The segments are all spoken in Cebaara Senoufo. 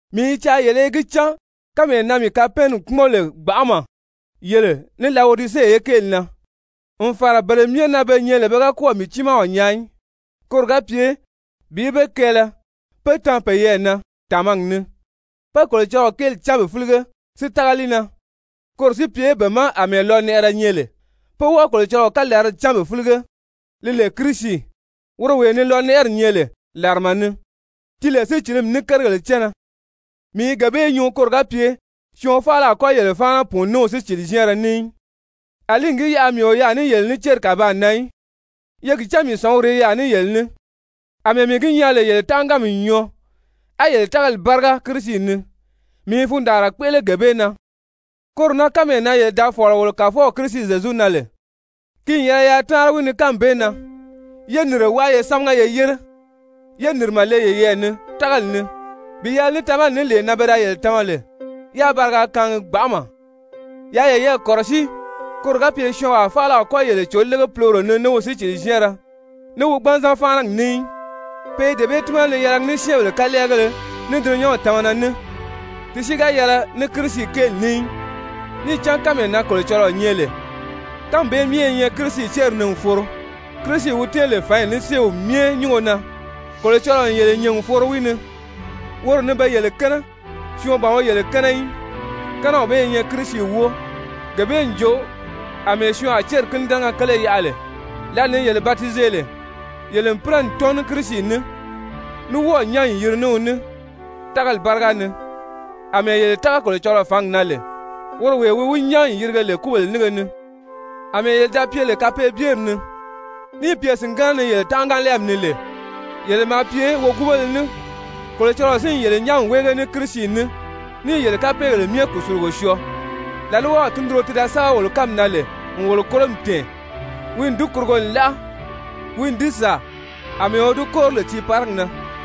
Mii i caa yele í gi cán kánmee na mii kapɛɛnni kpúmɔn lè gbanʔama yele, ní Lawodise ye kéeli na, n fàra bele myɛ na be nyɛ lè pe ga kɔ́ɔ̀ mii tiimaw nyaa í, koro ga pye bi be kɛɛlɛ, pé tan peyɛɛ na tàmagi ni, pé Kolocɔlɔɔ kéeli cán bi fílige si tága li na, koro si pye be ma àmɛɛ lɔnɛʔɛrɛ nyɛ lè, pé wɔ́ɔ Kolocɔlɔɔ kalarali cán bi fílige, li lè Kirisi, woro wee ni lɔnɛʔɛri nyɛ lè làrama ni, ti lè sícilimi ní kérigèle cánna. Mii i gee bee nyuu koro ga pye syɔɔn faala a kɔ́ yele fáana pùuni ní wi sícili-zyɛ́ɛnrɛ ní í. Alí n gi yaʔa mii o yaà ní yele ní céri kàbaan na í, ye gi cán mii sɔ̀nguri i yaà ní yele ní. Amɛɛ mii gi nyaa lè yele tánʔaganmi n nyɔɔ, á yele tágali báriga Kirisi ni, mii i fundaanra kpéʔele gee bee na. Koro na kánmee na yele da fɔ̀lɔ wolo Kàfɔw Kirisi Zyezu na lè, ki n yɛlɛ yaa táanri wi ni kánmi bee na. Ye nìnre wáa yé sámaga ye yére, yé nìrimɛ le yeyɛɛ ni tágali ni bi yɛlɛ ní tamani ní lee na pe da yele tama lè, yáā bariga kaangi gbanʔama. Yaa yeyɛɛ kɔ̀rɔsíi koro ga pye syɔɔnwaa faala a kɔ́ yele cǒ lége puloro ni ní wi sícili-zyɛ́ɛnri, ní wi gbanzan fáanagi ní í, pe i dee bee tímana ni yɛlɛgi ní syɛ́ɛnbèle kalɛɛgéle, ní dulunyanw tamana ní, ti si ga yɛlɛ ní Kirisi kéeli ní í. Níì cán kánmee na Kolocɔlɔɔ nyɛ lè, kánmi bee myɛ i nyɛ Kirisi céri ni n foro. Kirisi wi tɛ́ɛn lè fǎnyi, ní séew myɛ nyúngo na, Kolocɔlɔɔ n yele nyìn n foro wi ni. Woro ni be yele kɛ́nɛ, syɔɔn ban wi yele kɛ́nɛ í, kɛ́nɛw bee i nyɛ Kirisi wóo, gee bee n jo àmɛɛ syɔɔn a céri kínidɛnɛgɛ kele yaʔa lè. Lǎli ni yele batize lè, yele n pínɛ n tɔ́n ní Kirisi ní, ní wɔ́ɔ̀ nyán n yirige ní wi ní tágali báriga ni, àmɛɛ yele tága Kolocɔlɔɔ fǎngi na lè, woro wee wi wi nyán n yirige lè kúbèle nínge ni. Amɛɛ yele da pye lè kapeebyeri ni, níì pye sìngɛnɛ ni yele tánʔaganlɛɛmi ni lè, yele maa pye woguubéle ní, Kolocɔlɔɔ si n yele nyán n wéege ní Kirisi ní níì yele kapeegèle myɛ kùsulugo syɔɔ. Làlwaw tundunro ti da sɛ́bɛ wolo kánmi na lè n wolo kolomi tɛ̀ɛn, wi n di kurugo n láʔa. Wi n di sàa àmɛɛ wi di kóri lè tiiparigi na.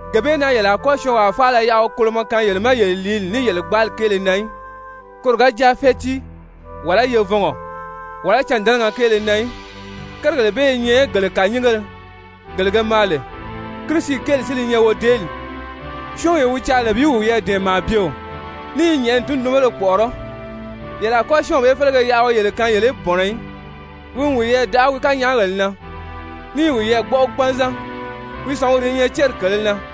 Gee bee na yele a kɔ́ syɔɔnwaa faala yaʔa wi kolomɔ kaan yele ma yele lìíli ní yele gbaali kéele na í, koro ga jáa fɛ́tii, wàlá yevɔngɔ, wàlá cândɛnɛgɛ kéele na í. Kérigèle bee i nyɛ gele kànyingéle gele ge maa lè, Kirisi kéeli si li nyɛ wodeeli. Syɔ́ɔnwee wi caa lè bi wiyɛɛ dɛ̀ɛn màabyeo ní i nyɛ̀ʔɛni tundunbéle kpɔ̀ʔɔrɔ́, yele a kɔ́ syɔ́ɔnw bee félege yaʔa wi yele kaan yele í bɔ̀nɔ í. Wi n wiyɛɛ daʔa wi kanyaagèle na ní i wiyɛɛ gbɔ́ʔɔgi gbanzan, wi sɔ̀nguri i nyɛ céri kèlē na.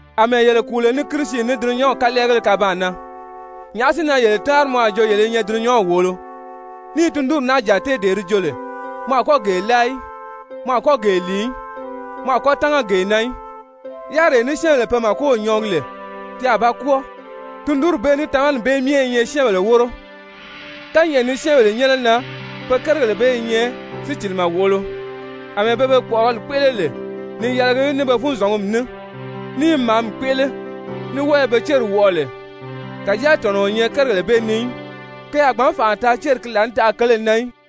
Amɛɛ yele kùu lè ní Kirisi ní dulunyanw kalɛɛgéle kabaan na, nyàʔá si na yele táanri mɔ a jo yele i nyɛ dulunyanw wòolo, ní i tundunri naa jàtée, dee di joo lè: «Mɔ a kɔ́ gee láa í! Mɔ a kɔ́ gee lìi í! Mɔ a kɔ́ tánga gee na í?» Yáriree ní syɛ́ɛnbèle pe màkow nyɔɔgi lè, ti a ba kwɔ́ɔ. Tundunri bee ní tamani bee myɛ i nyɛ syɛ́ɛnbèle wóro. Kányɛʔɛ ni syɛ́ɛnbèle nyɛ́nɛ na pe kérigèle bee i nyɛ sícilimɛ wòʔolo, àmɛɛ pe be kpɔ̀ʔɔrɔli kpéʔele lè ni yɛlɛgi ní be funzɔnguri ní, ní i màámi kpéʔele, ní wɔ́ɔ i be céri wɔʔɔ lè, kàjáa tɔ̀nɔ o nyɛ kérigèle bee ni í, ke a gbǎn fànʔa taa céri ki laànitaʔa kele na í.